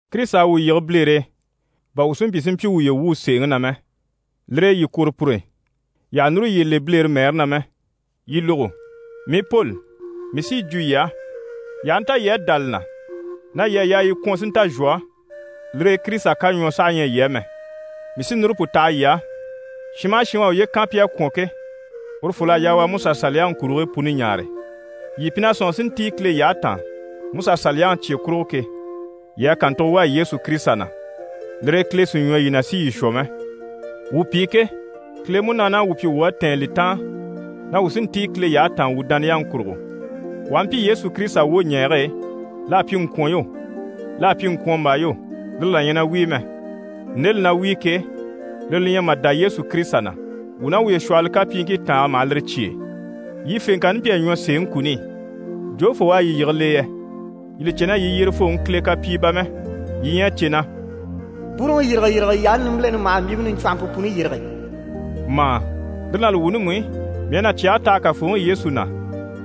Kirisita à wuu yige bilere e, bà wuu si mpyi si mpyi wuye wuu, sèeŋi na mɛ. Lire e yii kwôro pur'e, yii àha núru yiye le bilere mɛɛre na mɛ. Yii lógo! Mii Poli, mii sí yi jwo yii á, yii aha nta yii à dá li na na yii à yaa yii kwɔ̀n si nta zhwɔ, lire e Kirisita kaɲwɔɔ saha ɲyɛ yii á mɛ. Mii sí núru pu taha yii á, shin maha shin u à uye kan pi à kwɔ̀n ke, urufol'à yaa u a MusaSaliyaŋi kurigii puni ɲaare. Yii pi na ɲcaa si ntíi Kile yyahe taan Musa Saliyaŋi cye kurugo ke, yii à kàntugo wà Yesu Kirisita na, lire e Kile sì ɲwɔ yii na si yii shwɔ mɛ. Wuu pi ke, Kile Munaani à wuu pyi wuu à tɛ̀ɛn li taan na wuu sí n‑tíi Kile yyahe taan wuu dániyaŋi kurugo. Wuu aha mpyi Yesu Kirisita wwoɲɛɛge e, l'à pyi ŋkwɔ̀n yo, l'à pyi ŋkwɔ̀nmbaa yo, lire là ɲyɛ na wíi mɛ. Nde li na wíi ke, lire li ɲyɛ mà dá Yesu Kirisita na. Wuu ná wuye shwɔ̀hɔlɔ kapyiiŋkii tàange maha lire cyêe. Yii fèŋkanni mpyi a ɲwɔ sèeŋi kuni i, jofoo u à yii yige l'e yɛ? Yii li cè na yii yyerefooŋi Kile kapyii bà mɛ. Yii ɲyɛ a cè na: «bwúuruŋi yîrigeyirige yaani nimbileni maha mbyìmpe niɲcwɔnhɔmpe puni yîrige» mà? Lire ná li wuuni mú i, mii à cyɛge taha Kafooŋi Yesu na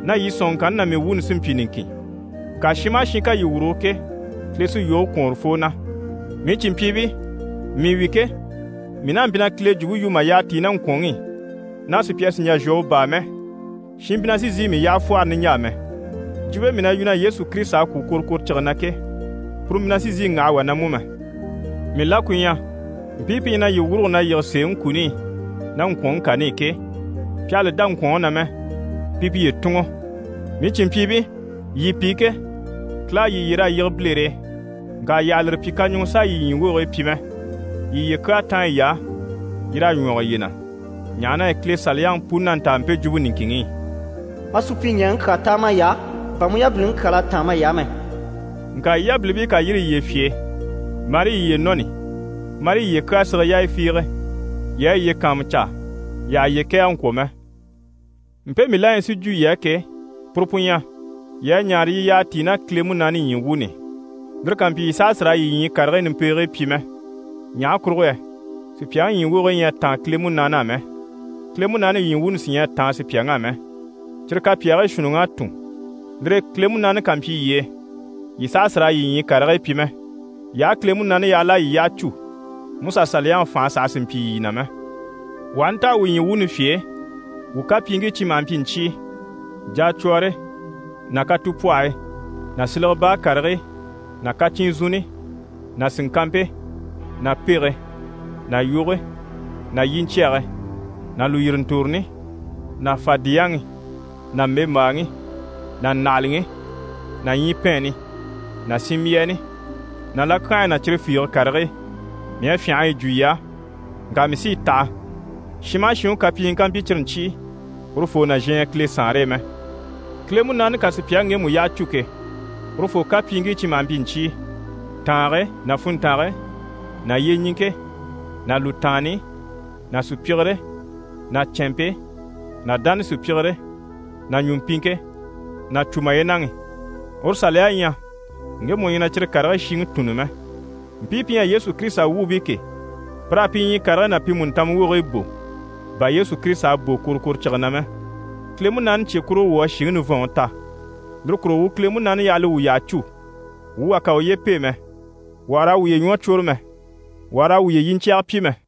na yii sɔ̀nŋɔŋkanni ná mii wuuni sí n‑pyi niŋkin. Ŋka shin maha shin ká yii wurugo ke, Kile sí yoge kwɔ̀n urufoo na. Mii cìnmpyiibii, mii wi ke, mii n'a mpyi na Kile jwumpe yu mà yyaha tíi ná ŋkwɔ̀nŋi i, na sùpya sì n-jà n-shwɔ u baa mɛ, shin mpyi na sì n‑sìi mii yyaha fwɔ́hɔrɔ niɲjaa mɛ. Jwumpe mii na yu, na Yesu Kirisita à kwû kworokworocige na ke, puru mpyi na sì n‑sìi n‑waha wà na mú mɛ. Mii la ku ɲyɛ, mpii pi ɲyɛ na yii wuruge na yige sèeŋi kuni i ná ŋkwɔ̀nŋi kani i ke, pi àha li dá ŋkwɔ̀nŋi na mɛ, pi piye tùnŋɔ! Mii cìnmpyiibii, yii pi ke, Kile à yii yyer'a yige bilere e, ŋka yii àha lire pyi kaɲuŋɔ s'a yii ɲyii wogigii pyi mɛ. Yii yiye kyaa táan yiy'á, yii raa ɲwɔge yiye na. Ɲaha na yɛ Kile Saliyaŋi puni na ntaa mpe jwumpe niŋkinŋi i: «Ma supyiɲɛɛŋi kyaa táan may'á, bà mu yabiliŋi kyal'à táan may'á mɛ.» Ŋka yii yabilimpii ká yîri yiye fye e, marii yiye nɔni, marii yiye kyaa sige yaaya fiige, yii a yiye kàanmucaa yii àha yiye kɛ̀ɛge ŋkwɔ̀ mɛ. Mpe mii la ɲyɛ si jwo yii á ke, puru pu ɲyɛ: yii a ɲaare yii yyaha tíi ná Kile Munaani ɲyii wuuni i, lire ká mpyi, yii saha sì raa yii ɲyii karigii nimpegigii pyi mɛ. Ɲaha kurugo yɛ sùpyaŋi ɲyii wogigii ɲyɛ a táan Kile Munaani á mɛ, Kile Munaani ɲyii wuuni sí ɲyɛ a táan sùpyaŋ'á mɛ. Cyire kapyaagii shuunniŋ'à tùn. Lire e Kile Munaani ká mpyi yii e, yii saha sì raa yii ɲyii karigii pyi mɛ. Yii aha Kile Munaani yaha l'à yii yyaha cû, Musa Saliyaŋi fànhe saha sì n‑pyi yii na mɛ. Wuu aha ntaha wuu ɲyii wuuni fye e, wuu kapyiiŋkii cyi maha mpyi ɲcyii: jacwɔɔre ná katupwɔhɔyi ná silege baa karigii ná kacyinzunni ná sìŋkanmpe ná pege ná yoge ná yiɲcyɛge ná lùyirintoroni ná fadiyaŋi ná mbèmbaaŋi ná ndàhalaŋi ná ɲyipɛɛnni ná sinmbyaani ná lakyanhayi ná cyire fiige karigii. Mii à fyânha a yi jwo, ŋka mii sí yi taha, shin maha shin u kapyiŋii ká mpyi cyire ɲcyii, urufoo nàzhan ɲyɛ Kile Saanre e mɛ. Kile Munaani ká sùpyaŋi ŋgemu yyaha cû ke, urufoo kapyiiŋkii cyi maha mpyi ɲcyii: tàange ná funntange ná yyeɲiŋke ná lùtaanni ná sùpyigire ná cɛ̀nmpe ná dánasupyigire ná ɲùmpiŋke ná cùmayenaŋi. Uru saliya ɲyɛ ŋgemu u ɲyɛ na cyire karigii shiŋi tùnni mɛ. Mpii pi ɲyɛ Yesu Kirisita wuubii ke, pir'à pi ɲyii karigii ná pi mùntanma wogigii bò, bà Yesu Kirisita à bò kworokworocige na mɛ. Kile Munaani cye kurugo wuu à shìŋi nivɔnŋi ta, lire kurugo, wuu Kile Munaani yaha li wuu yyaha cû. Wuu wà kà uye pêe mɛ, wuu àha raa wuye ɲwɔ cwôre mɛ, wuu àha raa wuye yiɲcyɛge pyi mɛ.